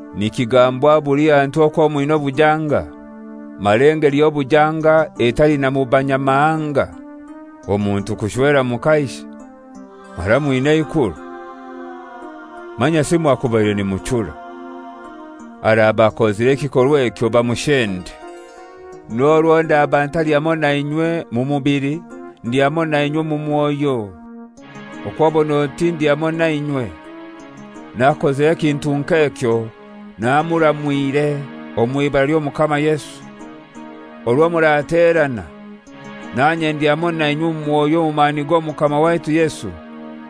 Nikigambwa buli hantu okwo mwina obujanga, mara engeli y'obujanga etali na mu banyamahanga; omuntu kushwera mukaishe! Mara mwina eikuru! Manyasi mwakubaire nimuchura! Araba akozire ekikorwa ekyo, bamushende. N'orwo ndaba ntali hamoi nainywe mu mubili, ndi hamoi nainywe omu mwoyo. Okw'obon'oti ndi hamoi nainywe, n'akozire ekintu nk'ekyo namuramwire omw'ibara ly'Omukama Yesu. Orwo muraterana, nanye ndi hamoi nainywe omu mwoyo omu mani g'Omukama waitu Yesu,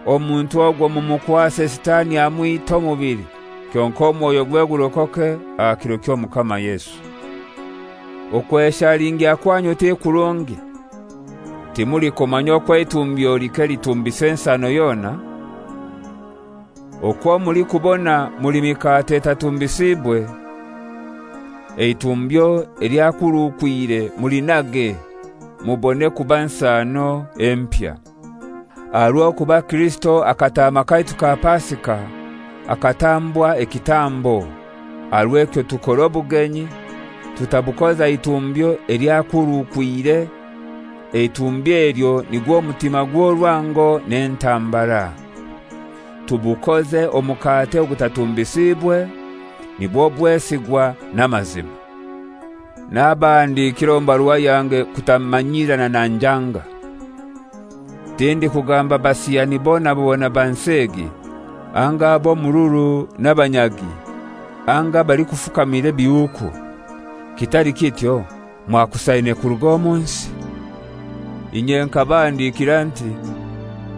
omuntu ogwo mumukwase Sitani amwite omubili, kyonkai omwoyogwe gurokoke aha kiro ky'Omukama Yesu. Okweshalingya kwanyu ti kurungi, timulikumanya okwo eitumbyo like litumbisa ensano yona? Okwo mulikubona muli mikate etatumbisiibwe, eitumbyo elyakurukwire mulinage mubone kuba nsano empya. Aha rw'okuba Kirisito akataama kaitu ka Pasika, akatambwa ekitambo. Aha rw'ekyo tukore obugenyi, tutabukoza itumbyo elyakurukwire, eitumbyo elyo nigwo mutima gw'orwango n'entambara: Tubukoze omukate ogutatumbisiibwe, nibwo bwesigwa n'amazima. Nabahandikiire omu barua yange kutamanyiirana na enjanga. Tindikugamba basiyani bona bona ba nsi egi, anga ab'omururu n'abanyagi, anga abalikufukamira ebihuuku; kitali kityo mwakusaine kuruga omu nsi. Inye nkabahandikira nti: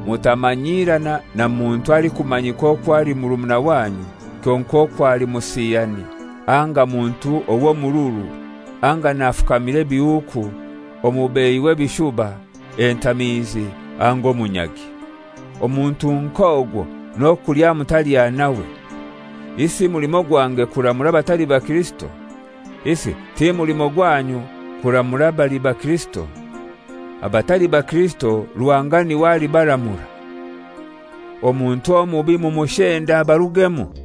Mutamanyirana na muntu alikumanyika okwo ali murumuna wanyu kyonkai okwo ali musiyani anga muntu ow'omururu, anga nafukamira ebihuuku, omubeihi w'ebishuba, entamiizi anga omunyagi. Omuntu nk'ogwo n'okulya mutalya nawe. Isi mulimo gwange kuramura abatali bakirisito? Isi ti mulimo gwanyu kuramura abali baKirisito? Abatali baKirisito Ruhanga n'iwe alibaramura. «Omuntu omubi mumushende abarugemu.»